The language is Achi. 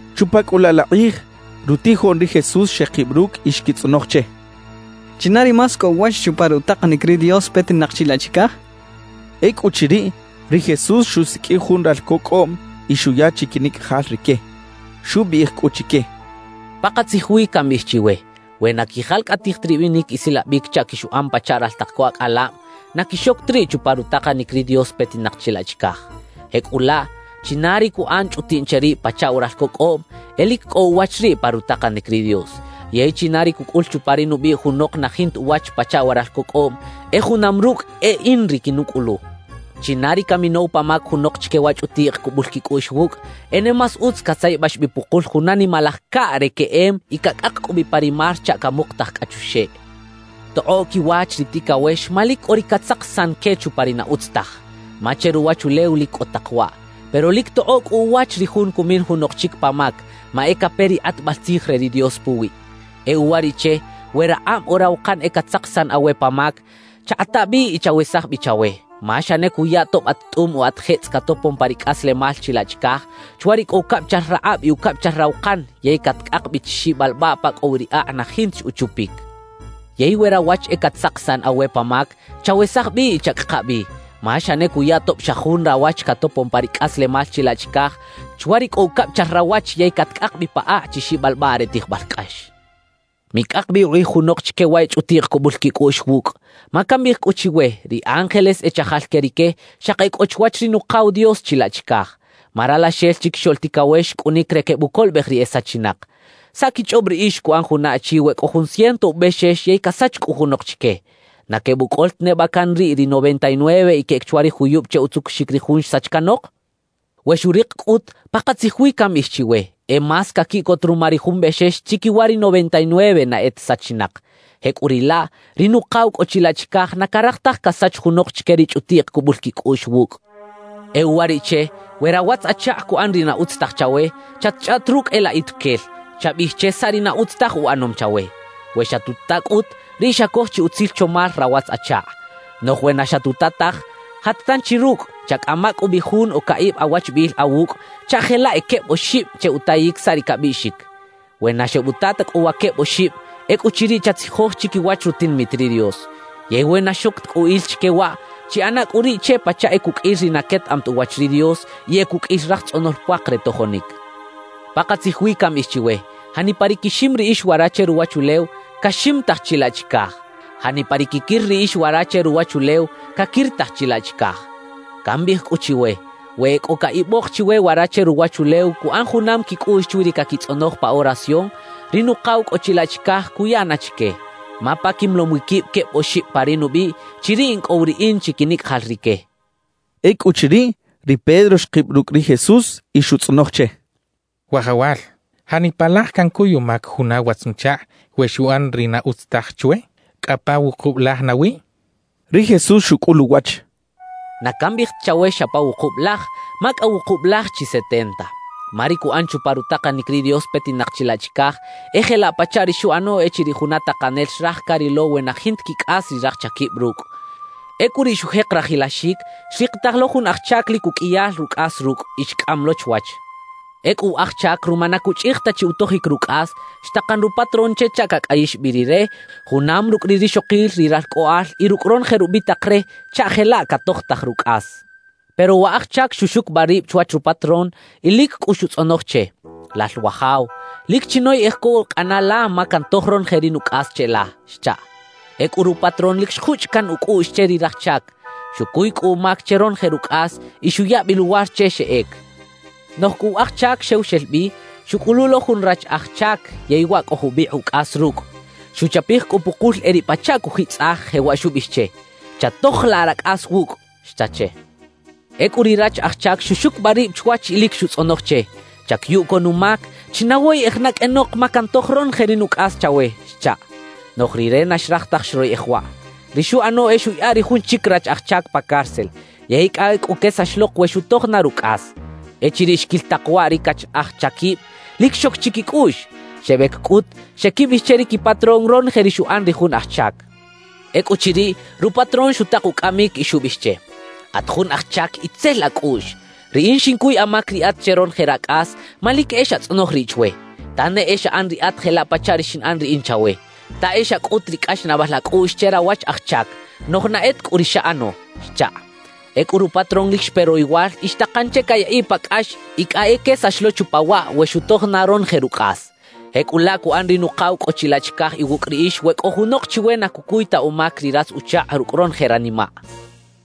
Chupa cꞌu laꞌ la kꞌij, rutijoꞌn ri Jesús xekib rucꞌ y xquitzꞌonoj che: —¿China ri más cꞌo uwach chupa rutakanic ri Dios petinak chilaꞌ chicaj? —xechaꞌ. Ecꞌuchiriꞌ, ri Jesús xusiqꞌuij jun ralco cꞌoꞌm y xuya chiquinicꞌajal rique. Xubiꞌij cꞌu chique: —Pakatzij wi cambiꞌij chiwe: We na quijalcꞌatij ta ribinic isilabic chaꞌ quixuꞌan pachaꞌ raltak co acꞌalab, na quixoc ta riꞌ chupa rutakanic ri Dios petinak chilaꞌ chicaj. Jecꞌulaꞌ, china ri cuꞌan chꞌutiꞌn che rib pachaꞌ wa ralco cꞌoꞌm, e lic cꞌo uwach riꞌ pa rutakanic ri Dios. Yey china ri cucꞌul chupa ri nubiꞌ junok na jinta uwach pachaꞌ wa ralco cꞌoꞌm, e junam rucꞌ e in ri quinucꞌulu. »China ri caminow pa mac junok chique wa chꞌutiꞌk cubul quicꞌuꞌx wucꞌ, e ne más utz catzayabax bi pukul juna nimalaj caꞌ re queꞌem y cacꞌak cꞌu bi pa ri mar chaꞌ camukutaj cꞌa chuxeꞌ. ¡Tokꞌoꞌ quiwach ri ticawex ma lic cꞌo ri catzakisan que chupa ri na utz taj! Ma che ruwachulew lic cꞌo tak waꞌ. Pero ¡lic tokꞌoꞌ cꞌu uwach ri jun cumin junok chic pa mac, ma e cape ri kꞌatbal tzij re ri Dios puwiꞌ! »E uwariꞌche, we rakꞌab o rawakan e catzakisan awe pa mac, chakꞌata bi y chawesaj bi chawe. Ma xa ne cuya tob at tꞌum o at jetzꞌ catopon pa ri cꞌaslemal chilaꞌ chicaj, chwa ri cꞌo ucabichal rakꞌab y ucabichal rawakan yey catcꞌak bi chi xibalbaꞌ pa cꞌo wi ri akꞌ na jinta chi uchupic. Yey we rawach e catzakisan awe pa mac, chawesaj bi y chacꞌaka bi. Ma xa ne cuya tob xa jun rawach catopon pa ri cꞌaslemal chilaꞌ chicaj, chwa ri cꞌo ucabichal rawach yey catcꞌak bi pa akꞌ chi xibalbaꞌ re tijbal cꞌax. »Micꞌak bi ukꞌij junok chique wa e chꞌutiꞌk cubul quicꞌuꞌx wucꞌ. Ma cambiꞌij cꞌu chiwe, ri ángeles e chajal que rique xaki e cꞌo chwach ri Nukaw Dios chilaꞌ chicaj. Ma Ralaxel Chiquixoꞌl Ticawex xcꞌunic re quebucolobej ri e sachinak. ¿Saꞌ quichꞌob riꞌix cuꞌan juna achi we cꞌo jun ciento ubexex yey casach cꞌu junok chique? ¿Na quebucꞌol ta neba can riꞌ ri noventa y nueve y queꞌec chwa ri juyub che utzucuxic ri jun xsach canok? We xurik cꞌut, pakatzij wi cambiꞌij chiwe: E más caquiꞌcot ruma ri jun bexex chiquiwa ri noventa y nueve na e ta sachinak. Jecꞌuriꞌlaꞌ, ri Nukaw cꞌo chilaꞌ chicaj na caraj taj casach junok chique ri chꞌutiꞌk cubul quicꞌuꞌx wucꞌ. »E uwariꞌche, we rawatz-achakꞌ cuꞌan ri na utz taj chawe, chatchꞌaꞌt rucꞌ e laꞌ ituquel; chabiꞌij che saꞌ ri na utz taj uꞌanom chawe. We xatuta cꞌut, riꞌ xacoj chi utzil chomal rawatz-achakꞌ. Noꞌj we na xatuta taj, jat tanchi rucꞌ; chacꞌama cꞌu bi jun o caꞌib awachbiꞌil awucꞌ chaꞌ jelaꞌ e queb oxib che utayic saꞌ ri cabiꞌxic. We na xebuta ta cꞌu wa queb oxib, ecꞌuchiriꞌ chatzijoj chiquiwach rutinamit ri Dios. Yey we na xoc ta cꞌu il chique waꞌ, chiꞌana cꞌu riꞌ che pachaꞌ e cuqꞌuil ri na quetaꞌam ta uwach ri Dios y e cuqꞌuil raj tzꞌonol puak re tojonic. Pakatzij wi cambiꞌij chiwe: Janipa ri quixim riꞌix wara che ruwachulew, caximitaj chilaꞌ chicaj. Janipa ri quiquir riꞌix wara che ruwachulew, caquiritaj chilaꞌ chicaj. Cambiꞌij cꞌu chiwe: We e cꞌo caꞌibok chiwe wara che ruwachulew cuꞌan junam quicꞌuꞌx chwi ri caquitzꞌonoj pa oración, ri Nukaw cꞌo chilaꞌ chicaj cuya na chique. Ma pa quimolom wi quib queb oxib pa ri nubiꞌ, chiriꞌ in cꞌo wi riꞌin chiquinicꞌajal rique —xchaꞌ. Ecꞌuchiriꞌ, ri Pedro xkib rucꞌ ri Jesús y xutzꞌonoj che: —Wajawal, ¿janipa laj cancuy umac juna watz-nuchakꞌ we xuꞌan ri na utz taj chwe? ¿Cꞌa pa wukub laj nawi? —xchaꞌ. Ri Jesús xucꞌul uwach: —Na cambiꞌij ta chawe xa pa wukub laj, ma cꞌa wukub laj chi setenta. »Ma ri cuꞌan chupa rutakanic ri Dios petinak chilaꞌ chicaj e jelaꞌ pachaꞌ ri xuꞌano echiriꞌ juna takanel xraj carilo we na jinta quicꞌas ri raj chaquib rucꞌ. Ecꞌu riꞌ xujek rajilaxic, xrikitaj lo jun aj chac lic uqꞌuiyal rucꞌas rucꞌ y xcꞌam lo chwach. Ecꞌu wa aj chac ruma na cuchꞌij ta chi utojic rucꞌas, xtakan rupatrón che chaꞌ cacꞌayix bi rire, junam rucꞌ ri rixokil, ri ralcꞌoꞌal y rucꞌ ronoje rubitak re chaꞌ jelaꞌ catojtaj rucꞌas. Pero wa aj chac xuxucubaꞌ rib chwach rupatrón y lic cꞌu xutzꞌonoj che: “Lal wajaw, lic chinoyꞌej co cꞌana la ma cantoj ronoje ri nucꞌas cheꞌla” xchaꞌ. Ecꞌu rupatrón lic xjuchꞌ caꞌn ucꞌuꞌx che ri raj chac. Xucuy cꞌu umac che ronoje rucꞌas y xuya bi luwar che xeꞌec. »Noꞌj cꞌu wa aj chac xew xel bi, xuꞌcꞌulu lo jun rach aj chac yey waꞌ cꞌo jubikꞌ ucꞌas rucꞌ. Xuchapij cꞌu pukul e riꞌ pachaꞌ cujitzꞌaj, jewaꞌ xubiꞌij che: “¡Chatojolaꞌ racꞌas wucꞌ!” xcha che. »Ecꞌu ri rach aj chac xuxucubaꞌ rib chwach y lic xutzꞌonoj che: “Chacuyu co numac, chinawoyꞌej na qꞌuenok ma cantoj ronoje ri nucꞌas chawe” xchaꞌ. »Noꞌj rire na xraj taj xroyeꞌej waꞌ. Ri xuꞌano e xuꞌyaꞌa ri jun chic rach aj chac pa cárcel; yey cꞌa ecꞌu quesax lok we xutoj na rucꞌas. »Echiriꞌ xquil tak waꞌ ri cach aj chaquib, lic xoc chiquicꞌuꞌx. Xebec cꞌut, xeꞌquibiꞌij che ri quipatrón ronoje ri xuꞌan ri jun aj chac. Ecꞌuchiriꞌ, rupatrón xutak ucꞌamic y xubiꞌij che: “¡At jun aj chac itzel acꞌuꞌx! Riꞌin xincuy amac riꞌat che ronoje racꞌas, ma lic e xatzꞌonoj riꞌ chwe. Ta ne e xaꞌan riꞌat jelaꞌ pachaꞌ ri xinꞌan riꞌin chawe, ta e xacꞌut ri cꞌaxnaꞌbal acꞌuꞌx che rawach aj chac; noꞌj na e ta cꞌu ri xaꞌano” xchaꞌ. »Ecꞌu rupatrón lic xpe royowal y xtakan che cayaꞌiꞌ pa cꞌax y cꞌa e quesax lo chupa waꞌ we xutoj na ronoje rucꞌas. »Jecꞌulaꞌ cuꞌan ri Nukaw cꞌo chilaꞌ chicaj iwucꞌ riꞌix we cꞌo junok chiwe na cucuy ta umac ri ratz-uchakꞌ rucꞌ ronoje ranimaꞌ —xchaꞌ.